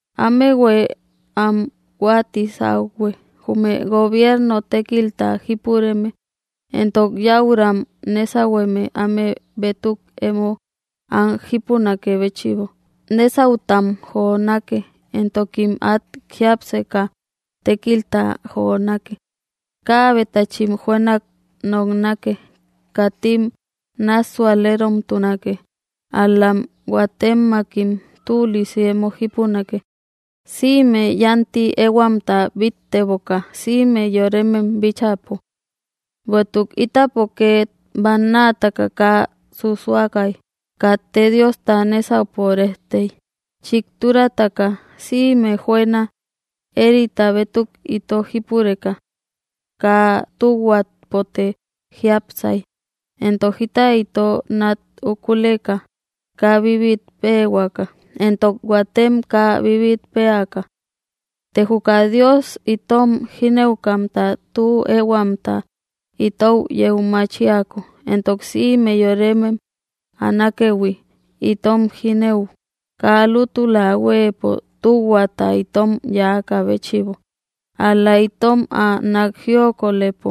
Amëhue am huatisauhue, jume gobierno tékilta jipureme entok yäuram nesahueme áme bétuk emo am jípunakë béchïbo, nesautam jonake entokim at jiapseka tékilta jonake. Kaabetachim juënak noknake, katim nássuäleromtunake, ál‑lam huatemmakim tülisi emo jipunake, simë yanti ehuamta bittteboka sïme yoremem bíchäpo. Bueïtuk ítapo ket bannaataka kaa susuakay, katte Diosta nésaupo rejtey, chikturataka, sïme juëna éerita bétuk ito jípureka. Kaa tühuapote jiápsay, éntok jita ito nat úkuleka, kaa bibit péehuaka, éntok huatem kaa bibit péaka. Të juka Dios itom jínëukamta tü ehuamta itou yeu machiako, éntok sïme yoremem ä nákëhui, itom jínëuk, kaa lútula huëpo tuhuata itom yáakä béchïbo, ál‑la itom ä nak jiokolëpo,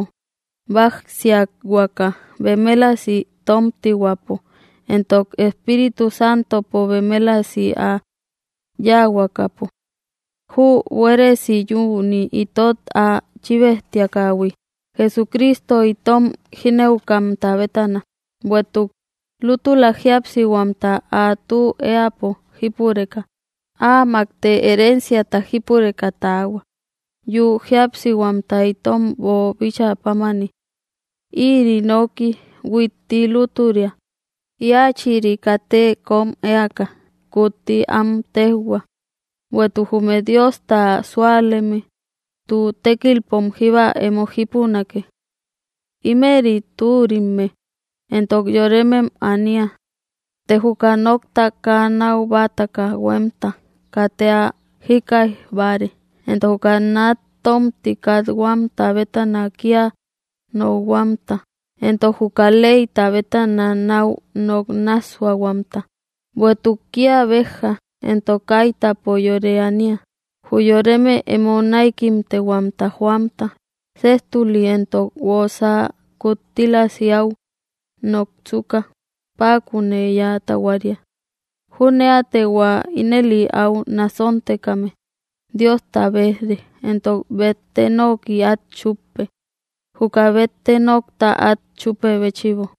bajsiahuaka bemélasi tomtihuäpo, entok Espíritu Santopo bemélasi ä yahuakapo. Jü, buéresi yüni itot ä chíbejtiakähui, Jesucristo itom jínëukamta bétana, bueïtuk lútula jíapsihuamta ä tü eäpo jípureka, amakte herenciata jípureka tahua, yü jíapsihuamta itom boobichä pámani. Ïri nooki huitti lútüria, Íachïri katë kom eaka, kutti am téjhua, bueïtuk jume Diosta súaleme tü tekilpom jíba emo jipunake. Ímëri türimme, éntok yoremem ania. Të juka nokta kaa nau bataka huemta katë ä jikkaijbáare, entok juka nat tomti kat‑huamta bétana kia nokhuamta, entok juka leyta bétana nau nok nássuahuamta, bueïtuk kia bejja entok kaitapo yore ania. Jü yoreme emo näikimtehuamta joamta, séjtuli entok guosa kuttílasi áu noksuka, pakunë yä tahuaria. Juneate hua ínëli áu nasontekame, Diosta bejre, entok bette noki at chuppe, juka bette nokta at chupe béchïbo.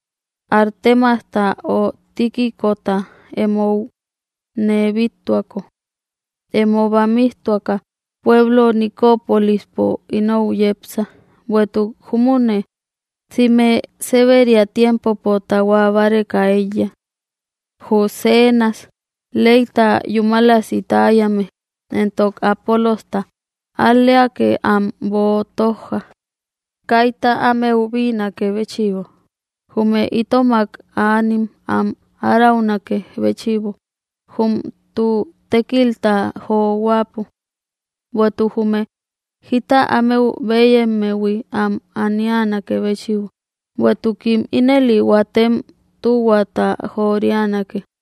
Artemasta ö Tíquicota émou nee bíttuako. Emo bamijtuaka pueblo Nicópolispo inou yepsa, bueïtuk júmüne, sïme séberia tiempopo tahua báreka eiya. Jü Zénas leyta yúmalasi täyame éntok Apoolojta, al‑leake am boo tojja, kayta ámeu bïnakë béchïbo. Jume itomak aanim am áraunakë béchïbo, jum tü tékilta johuäpo. Bueïtuk jume jita ámeu bëyemmehui am anianakë béchïbo; bueïtukim ínëli huatem tuhuata joorianake.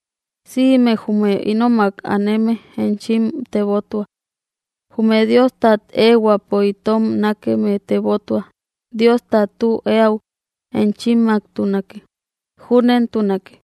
Sïme jume ínomak aneme enchim tebotua. Jume Diostat ehuäpo itom nakemë tebotua, Diosta tü eäu enchimmaktunake. Júnentunake.